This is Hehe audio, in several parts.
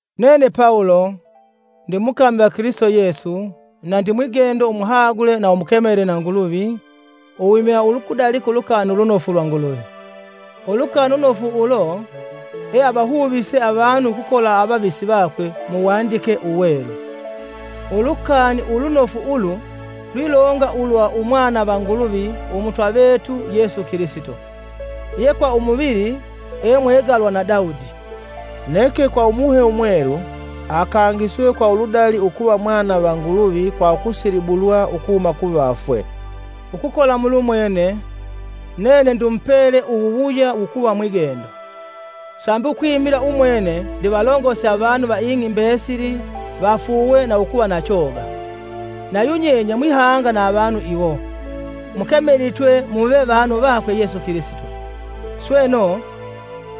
Nene Pawulo, ndimukami va Kilisito Yesu na Ndimwigendo umuhagule na umukemele na Nguluvi uwimila ukudalika Ulukani Ulunofu lwa Nguluvi. Ulukani Ulunofu ulo eavahuvise avanu ukukola avavisi vakwe mu Wandike Uwelu. Ulukani Ulunofu ulu lwilonga ulwa Umwana va Nguluvi Umutwa vetu Yesu Kilisito, ye kwa umuvili, e mwegalwa na Daudi, Neke kwa Umuhe Umwelu akangiswe kwa uludali ukuva Mwana va Nguluvi kwa ukusilibulwa ukuhuma kuvafwe. Ukukola mulumwene, nene ndimupele uwuwuya wukuva mwigendo, sambi ukwimila umwene ndivalongose avanu va ing'i mbesili vafuuwe na ukuva na choga. Na yunyenye mwihanga na avanu iwo, mukemelitwe muve vanu vakwe Yesu Kilisito. Sweno,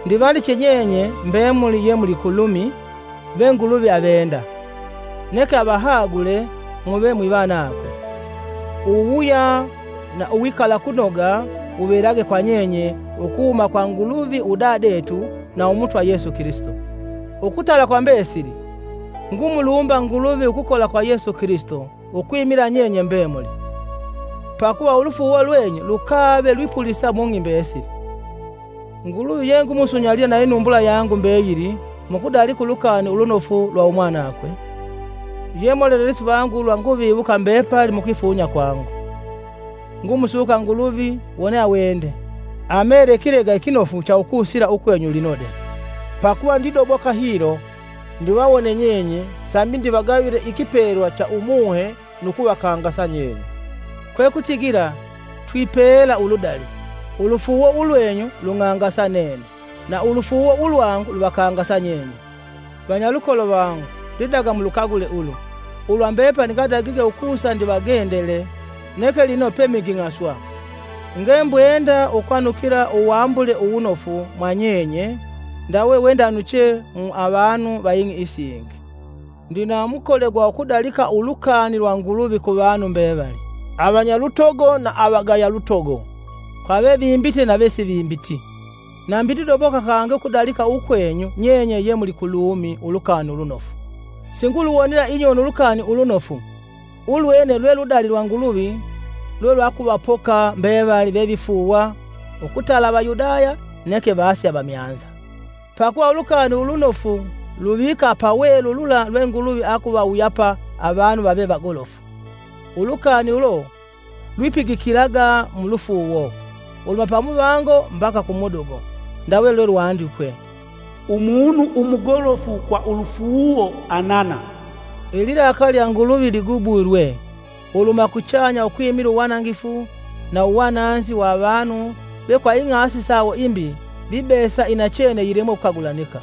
ndivandiche nyenye mbemuli yemuli ku Lumi ve Nguluvi avenda, neke avahagule muve mwivanakwe. Uwuwuya na uwikalakunoga wuvelage kwa nyenye ukuhuma kwa Nguluvi udadetu na Umutwa Yesu Kilisito. Ukutala kwa mbesili, ngumulumba Nguluvi ukukola kwa Yesu Kilisito ukwimila nyenye mbemuli, pakuva ulufuuwo lwenyu lukave lwipulisa mung'i mbesili. Nguluvi yengumusunyalila inumbula yangu mbeyili mu kudalika Ulukani Ulunofu lwa Umwanakwe, ye molelesi vangu ulwa nguviwuka mbepali mukwifunya kwangu. Ngumusuka Nguluvi wone awende, amele ikilega ikinofu cha ukusila ukwenyu lino de. Pakuva ndidoboka hilo ndivawone nyenye sambi ndivagavile ikipelwa cha Umuhe nu kuvakangasa nyenye. Kwekutigila twipela uludali: ulufuuwo ulwenyu lung'angasa nene, na ulufuuwo ulwangu luvakangasa nyenye. Vanyalukolo vangu ndidaga mulukagule ulu, ulwa mbepali ndadagige ukusa ndivagendele neke lino peminging'aswa. Ngembwenda ukwanukila uwambule uwunofu mwa nyenye ndawe wendanuche mu avanu va ing'i isingi. Ndina mukole gwa ukudalika Ulukani lwa Nguluvi kuvanu mbevali, avanyalutogo na avagayalutogo, kwa vevimbite na vesivimbiti. Nambi ndidoboka kangi ukudalika ukwenyu nyenye ye muli ku Lumi Ulukani Ulunofu. Singuluwonela inyoni Ulukani Ulunofu, ulwene lwe ludali lwa Nguluvi lwelwakuvapoka mbevali vevifuuwa ukutala Avayudaya neke vase avamyanza. Pakuva Ulukani Ulunofu luvika pawelu lula lwe Nguluvi akuvawuyapa avanu vave vagolofu; ulukani ulo lwipigikilaga mu lufuuwo, uluhuma pamuvango mbaka kumudugo. Ndawe lwandikwe, “Umunu umugolofu kwa ulufuuwo anana.” Ililakali lya Nguluvi ligubwilwe uluhuma kuchanya ukwimila uwanangifu na uwananzi wa avanu ve kwa ing'asi sawo imbi vibesa inachene yilemwe ukukagulanika.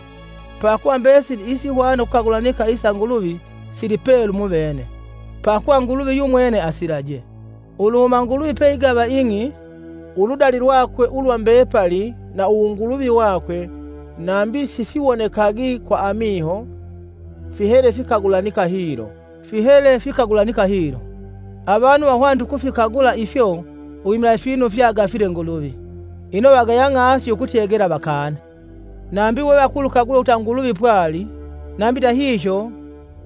Pakuva mbesili isihwana ukukagulanika isa Nguluvi silipelu muvene, pakuva Nguluvi yumwene asilaje. Uluhuma Nguluvi peigava ing'i, uludali lwakwe ulwa mbepali na uwunguluvi wakwe nambi sifiwonekagi kwa amiho, fihele fikagulanika hilo. Avanu vahwanite ukufikagula ifyo uwimila ifinu fye agafile Nguluvi. Ino vagaya ng'asi ukwikolela ukukana! Nambi we vakulukagula ukuta Nguluvi pwali, nambi ndahihyo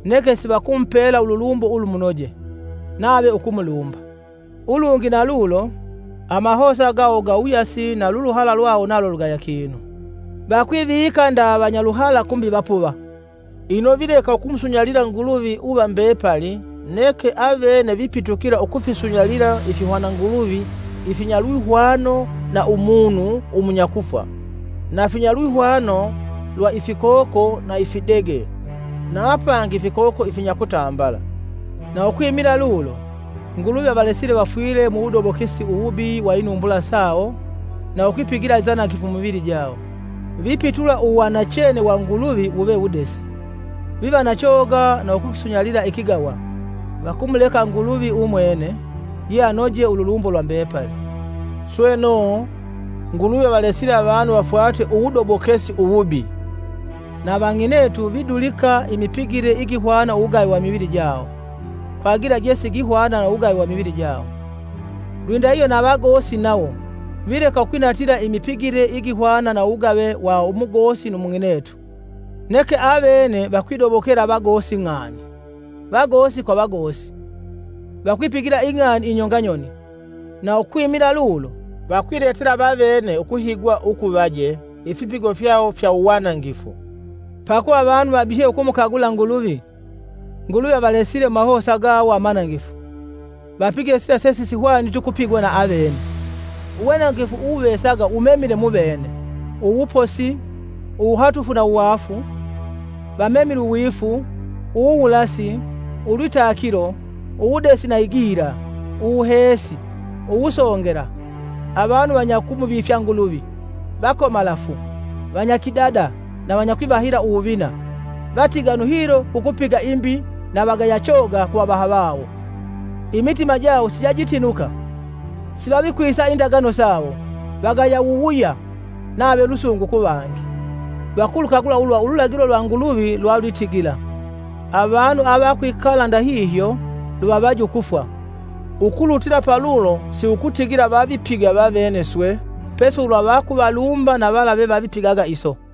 neke sivakumupela ululumbo ulumunoje, nave ukumulumba. Ulungi na lulo, amahosa gawo gawuyasi na luluhala lwawo nalo lugaya kinu. Vakwivika nda vanyaluhala kumbi vapuva. Ino vileka ukumusunyalila Nguluvi uva mbepali neke avene vipitukila ukufisunyalila ifihwananguluvi ifinya lwihwano na umunu umunyakufwa, na finya lwihwano lwa ifikoko na ifidege, na apangi ifikoko ifinyakutambala. Na ukwimila lulo, Nguluvi avalesile vafwile mu wudobokesi uwubi wa inumbula sawo na ukwipigila inzanangifu mumivili jawo. Vipitula uwanachene wa Nguluvi wuve wudesi; vivanachoga na ukukisunyalila ikigawa, vakumuleka Nguluvi umwene, ye anoje ululumbo lwa mbepali! Sweno, Nguluvi avalesile avanu vafwate uwudobokesi uwubi. Na vang'inetu vidulika imipigile igihwana uwugave wa imivili jawo, kwa gila jesigihwana na uwugave wa imivili jawo. Lwindahihyo na vagosi nawo, vileka ukwinatila imipigile igihwana na uwugave wa umugosi nu mung'inetu, neke avene vakwidobokela vagosi ng'ani. Vagosi kwa vagosi, vakwipigila ing'ani inyonga nyoni, na ukwimila lulo, vakwiletela vavene ukuhigwa ukuvaje ifipigo fyawo fya uwanangifu. Pakuva avanu vabihye ukumukagula Nguluvi, Nguluvi avalesile mumahosa gawo amanangifu, vapige sila sesisihwaniti ukupigwa na avene. Uwanangifu uwuvesaga wumemile muvene, uwuposi, uwuhatufu na uwaafu, vamemile uwifu, uwuwulasi, ulwitakilo, uwudesi na igila; uwuheesi, uwusongela, avanu avanyakumuvifya Nguluvi, vakomalafu, vanyakidada na vanyakwivahila uwuvina, vatiganu hilo kukupiga imbi na vagaya choga kuvavaha vawo; imitima jawo sijajitinuka, sivavikwisa indagano sawo, vagaya wuwuya nave lusungu kuvangi. Vakulukagula ulwa ululagilo lwa Nguluvi lwalwitigila, avanu avakwikala ndahihyo luvavaje ukufwa. Ukulutila paulo siukutigila vavipiga vavene swe, pesi ulwa vakuvalumba na vala vevavipigaga iso.